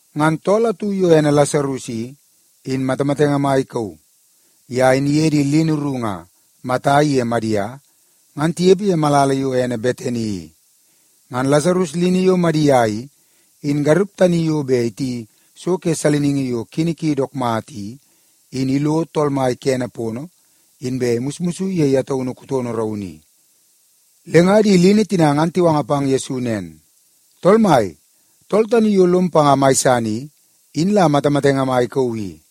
Ngan tool atu yo ene Lasarus i, in matamatenge mai ikauu. Ye in iye di lini ru nga Mata iye Madia, ngan tinepe ye malala yo ene Betani i. Ngan Lasarus lini yo Madia i, in garup tani yo bet iti so ke saliningi yo kini ki dook mata i, in ilo Tool Mai kene pono, inbe imusmus ye ye taunu kutono raunu i. Le nga di lini tina ngan tiwanga pang Yesu nen, “Tool Mai, tool tani yo lom panga mai san i, in la matamatenge mai ikauu i.”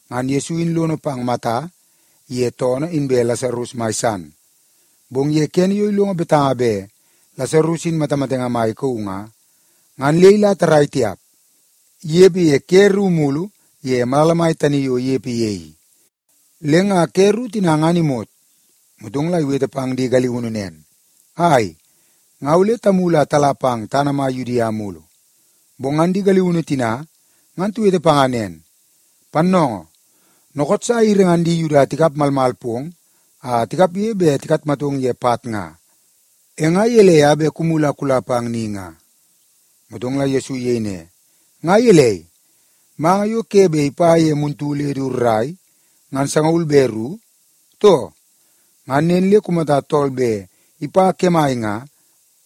Ngan Yesu in lono pang Mata iye toonoo inbe Lasarus mai san, bong ye kene yo ilongo betanga bet Lasarus in matamatenge mai ikauu nga, ngan le ila tarrai tiap. Inepe ye ke ru mulu ye malala tani yo inepe ye i. Le nga ke ru tina ngan imot, motong la iwete pang di galiunu nen, “Ai, nga ole tamulu a tala pang tana mai Yudia mulu.” Bong ngan di galiunu tina ngan tiwete panga nen, “Pannoongoo, dookoot sa airi ngan di Yuda tikap malmal pong a tikapge bet tikatmatong ye pat nga. E nga gelei a bet kumulu a kula pang ni nga?” Motong la Yesu iyei ne, “Nga gelei, manga yo ke bet ipa ye muntu le du rrai, ngan sangaul be ru, too? Ngan nen le kumata tool bet ipa kemai nga,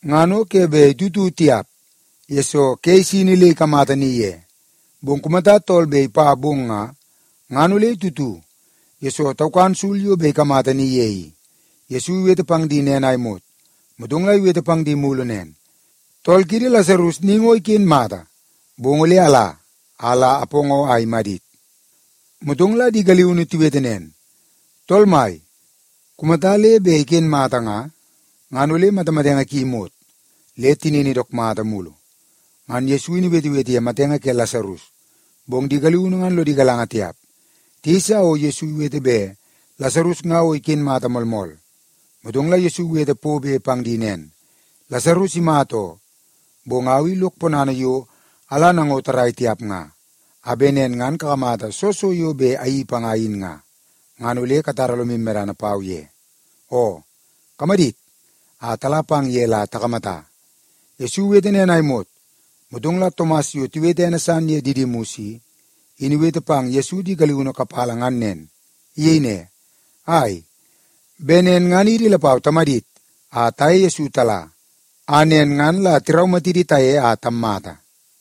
ngan o ke bet itutu tiap, yesoo ke isini le ikamata ni ye. Bong kumata tool bet ipa bong nga, ngan ole itutu, yesoo taukan sul yo bet ikamata ni ye i.” Yesu iwete pang di nen a imot, motong la iwete pang di mulu nen, “Tool kiidi Lasarus ni ngo iken mata. Bong ole ala, a la apoongoo a imadit.” Motong la di galiunu tiwete nen, “Tool Mai, kumata le bet iken mata nga, ngan ole matamatenge ki imot, le tinini dook mata mulu.” Ngan Yesu in iwetewete ye matenge ke Lasarus, bong di galiunu ngan lodi galanga tiap. Tiyeisa o Yesu iwete bet Lasarus nga o iken mata moolmool. Motong la Yesu iwete pobe pang di nen, “Lasarus imata oo, bong au i lok ponana yo ala nango tarrai tiap nga, a bet nen ngan kakamata soo so yo bet ayeii panga in nga, ngan ole katara lomu medana pau ye. Oo, kamadit a tala pang ye la takamata.” Yesu iwete nen a imot, motong la Tomas yo tiwete ene san ye Didimus i, in iwete pang Yesu di galiunu kapala ngan nen. Iyei ne, “Ai, bet nen ngan idi lapau tamadit a taye Yesu tala, a nen ngan la tiraumatidi taye a tammata.”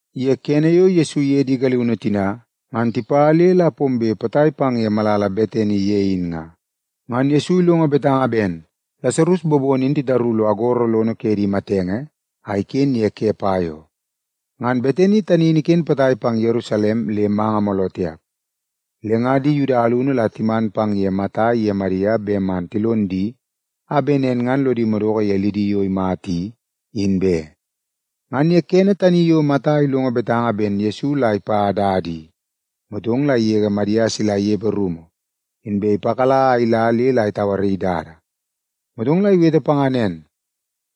Ye kene yo Yesu iye di galiunu tina ngan tipa le la pombe potai pang ye malala Betani ye in nga, ngan Yesu ilongo betanga ben Lasarus bobono in titaru lo agoro lono ke di matenge a iken ye ke pai oo. Ngan Betani tani in iken potai pang Yerusalem le manga mooloo tiap. Le nga di Yuda alunu la timan pang ye Mata iye Madia bet man tilon di a bet nen ngan lodi madoko ye lidi yo imata i, in be. Ngan ye kene tani yo Mata ilongo betanga ben Yesu la ipa dada i, motong la igege Madia sila inepe rumu, inbe ipakala a ila le la itauaraii dada. Motong la iwete panga nen,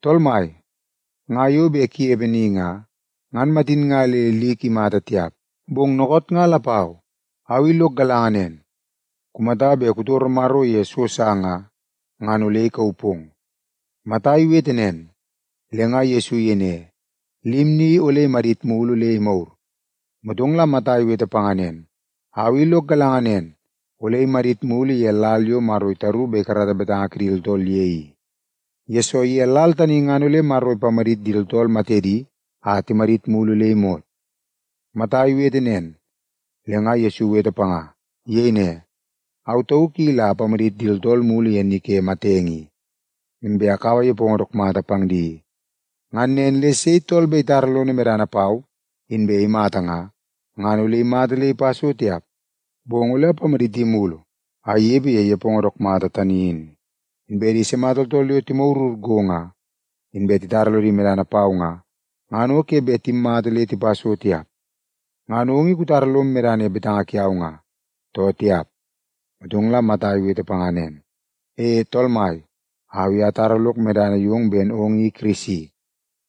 “Tool Mai, nga yo bet kunepe ni nga, ngan matin nga le lik imata tiap. Bong dookoot nga lapau, au i lok galanga nen, kumata bet kutoro Maro ye so sa nga, ngan ole ikauu pong.” Mata iwete nen, le nga Yesu iyei ne, “Lim ni ole imadit mulu le imagur.” Motong la Mata iwete panga nen, “Au i lok galanga nen, ole imadit mulu ye lal yo Maro itaru bet ikarata betanga kidi tooltool ye i. Yesoo, ye lal tani ngan ole Maro ipamadit di tooltool matedi a timadit mulu le imot.” Mata iwete nen, le nga Yesu iwete panga. Iyei ne, “Au tauk i la apamadit di tooltool mulu ye ni ke matenge i, inbe akaua nepongo dook mata pang di i. Ngan nen le sei tool bet itara lono medana pau inbe imata nga, ngan ole imata le ipa so tiap, bong ole imadit mulu a inepe ye nepongo dook mata tani in. Inbe di sima tooltool yo timagurgur go, inbe titara lodi medana pau nga, ngan o ke bet timmata le tipa so tiap. Ngan ong i kutara lom medana ye betanga kiau nga, too tiap?” Motong la Mata iwete panga nen, “E, Tool Mai, au i atara lok medana yong ben ong i Kirisi.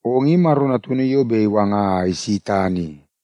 Ong i Maro Natunu yo bet iwanga a isi tana i.”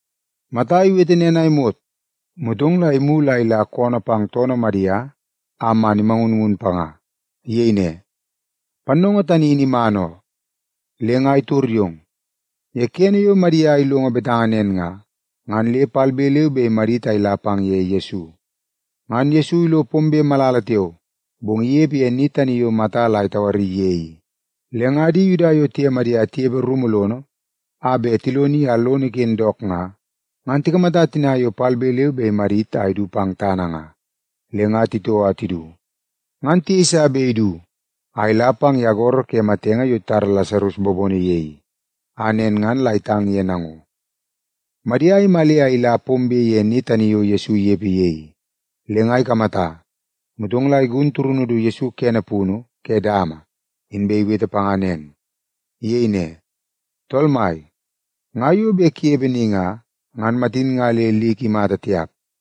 Mata iwete nen a imot, motong la imulu a ila koonoo pang toonoo Madia a man imangunngun panga. Iyei ne, “Pannoongoo tani in iman oo, le nga itor yong.” Ye kene yo Madia ilongo betanga nen nga, ngan le palbe leu be imadit a ila pang ye Yesu. Ngan Yesu ilo pombe malala tiao, bong inepe ye ni tani yo Mata la itauaraii ye i. Le nga di Yuda yo tiye Madia tinepe rumu lono a bet tiloni a lono iken dook nga, ngan tikamata tina yo palbe leu be imadit a idu pang tana nga, le nga titoo a tidu. Ngan tiyeisa bet idu a ila pang ye agoro ke di matenge yo titara Lasarus bobono ye i, a nen ngan la itang ye nango. Madia imale a ila pombe ye ni tani yo Yesu inepe ye i, le nga ikamata, motong la igun turunu du Yesu kene punu ke dama, inbe iwete panga. Iyei ne, “Tool Mai, nga yo bet kunepe ni nga, ngan matin nga le lik imata tiap.”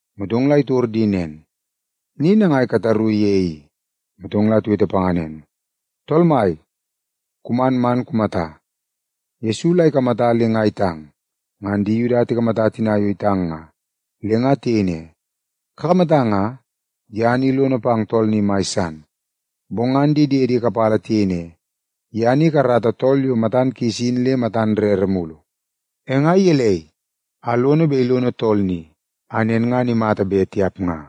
Motong la itor di nen, “Ni nangai kataru ye i?” Motong la tiwete panga nen, “Tool Mai, kuman man kumata.” Yesu la ikamata le nga itang. Ngan di Yuda tikamata tina yo itang nga, le nga tiyei ne, “Kakamata nga, ye ni lono pang tool ni mai san.” Bong ngan di diedi kapala tiyei ne, “Ye ni ikarata tool yo matan kis in le matan rere mulu, e nga gelei a lono bet ilono tool ni a nen ngan imata be, tiap nga?”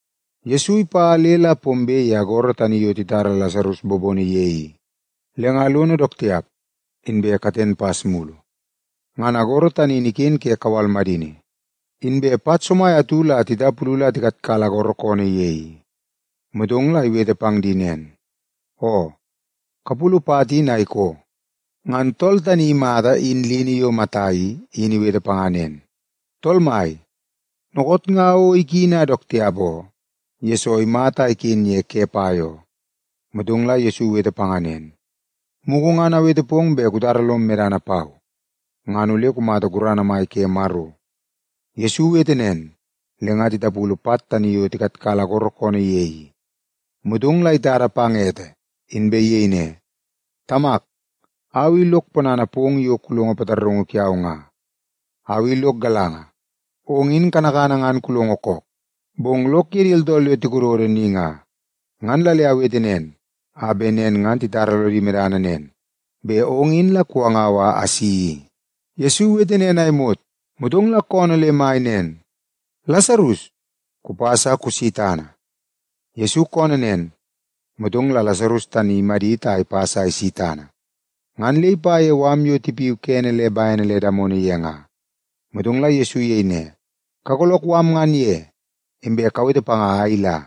Yesu ipa le la pombe ye agoro tani yo titara Lasarus bobono ye i, le nga lono dook tiap, inbe katen pas mulu. Ngan agoro tani in iken ke kawal madini. Inbe pat somai atu la titapulu la tikatkala agoro koonoo ye i. Motong la iwete pang di nen, “Oo, kapulu pat in a ikoo.” Ngan tool tani imata in lini yo Mata i, in iwete panga nen, “Tool Mai, dookoot nga o ikini a dook tiap oo, yesoo imata a iken ye ke pai oo.” Motong la Yesu iwete panga nen, “Mugu ngan awete pong bet kutara lom medana pau, ngan ole kumata gurana mai ke Maro.” Yesu iwete nen, le nga tipulu pat tani yo tikatkala agoro koonoo ye i. Motong la itada pang ete, inbe iyei ne, “Tamak, au i lok ponana pong yo kulongo pataraungu kiau nga. Au i lok galanga, ong in kanakana ngan kulongo kook. Bong lok ye di tooltool yo tikododo ni nga, ngan la le awete nen, a bet nen ngan titara lodi medana nen, bet ong in la kuwangau a asi i.” Yesu iwete nen a imot, motong la koonoo le mai nen, “Lasarus, kupas a kusi tana!” Yesu koonoo nen, motong la Lasarus tani in imadit a ipas a isi pang tana. Ngan le ipa ye mala tina yo tipiu kene le bene le damono ye nga. Motong la Yesu iyei ne, “Kagoolook mala ngan ye, inbe kawete panga a ila.”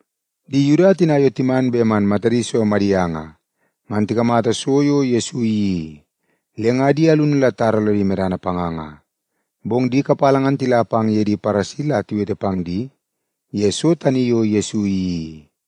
Di Yuda tina yo timan bet man matadi so Madia nga, ngan tikamata so yo Yesu iyeii i, le nga di alunu la titara lodi medana panga nga. Bong di kapala ngan tila pang ye di Paresi la tiwete pang di ye so tani yo Yesu iyeii i.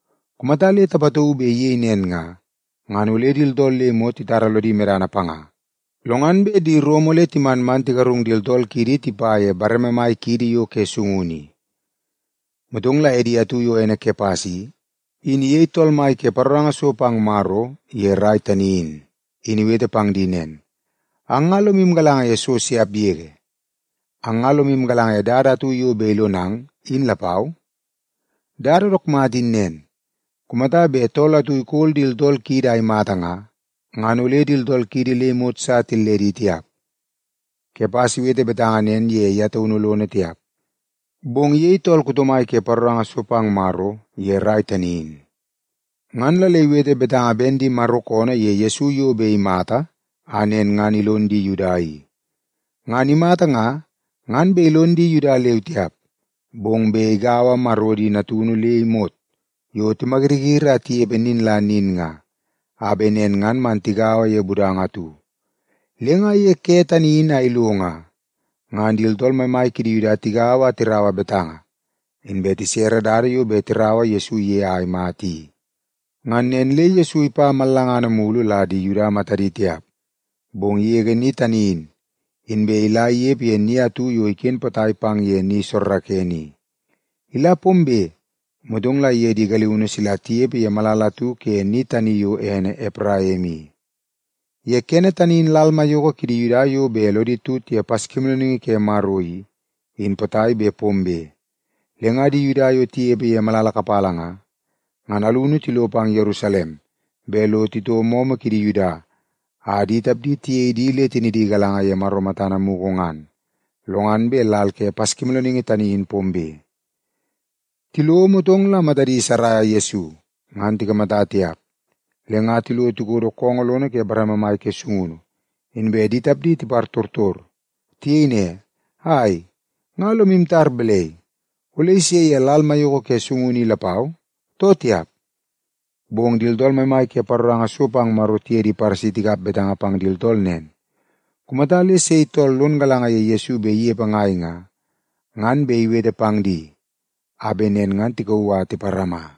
Kumata le tapatauu bet iyei nen nga, ngan ole di tooltool le imot titara lodi medana panga. Lo ngan bet di Rom ole timan man tigarung di tooltool kiidi le tipa ye bareme mai kiidi yo ke sungunu i.” Motong la edi atu yo ene Kepas i, in iyei tool mai ke paroranga so pang Maro ye rai tani in, in iwete pang di nen, “Ang nga lomu galanga ye so siap yege! Ang nga lomu galanga ye dada atu yo bet ilonang, in lapau? Dada dook mata in nen: Kumata bet tool atu ikol di tooltool kiidi a imata nga, ngan ole di tooltool kiidi le imot sa tilledi tiap.” Kepas iwete betanga nen ye ye taunu lono tiap, bong iyei tool kuto mai ke paroranga so pang Maro ye rai tani in, ngan la le iwete betanga ben di Maro koonoo ye Yesu yo bet imata a nen ngan ilon di Yuda i. Ngan imata nga, ngan bet ilon di Yuda leu tiap, bong bet igaua Maro di natunu le imot yo timayiriyiri a tinepe nin la nin nga, a bet nen ngan man tigaua ye budanga atu. Le nga ye ke tani in a ilo nga, ngan di tooltool maimai kidi Yuda tigaua a tirau betanga, inbe tisere dada yo bet tiraua Yesu ye a imata i. Ngan nen le Yesu ipa mallangana mulu la di Yuda matadi tiap, bong igege ni tani in, inbe ila inepe ye ni atu yo iken potai pang ye ni soorookoonoo i. Ila pombe, motong la iye di galiunu sila tinepe ye malala atu ke ni tani yo ene Epraim i. Ye kene tani in lal maiyoko kidi Yuda yo bet lodi tut ye Paskimoolooningi ke Maro i, in potai bet pombe. Le nga di Yuda yo tinepe ye malala kapala nga, ngan alunu tilo pang Yerusalem bet lo titoo momo kidi Yuda a di tapdi tiyei di le tinidi galanga ye Maro matana mugu ngan, lo ngan bet lal ke Paskimoolooningi tani in pombe. Tilo, motong la matadi saraia Yesu, ngan tikamata tiap. Le nga tilo tikodo koongoo lono ke bareme mai ke sungunu, inbe di tapdi tipartortor. Tiyei ne, “Ai, nga lomu tar balai? Ole ise ye lal maiyoko ke sungunu i lapau, too tiap?” Bong ngan di tooltool maimai ke paroranga so pang Maro tiye di Paresi tikap betanga pang di tooltool nen, kumata le sei tool lon galanga ye Yesu bet inepe ngai nga, ngan bet iwete pang di a bet nen ngan tikauu a tiparama.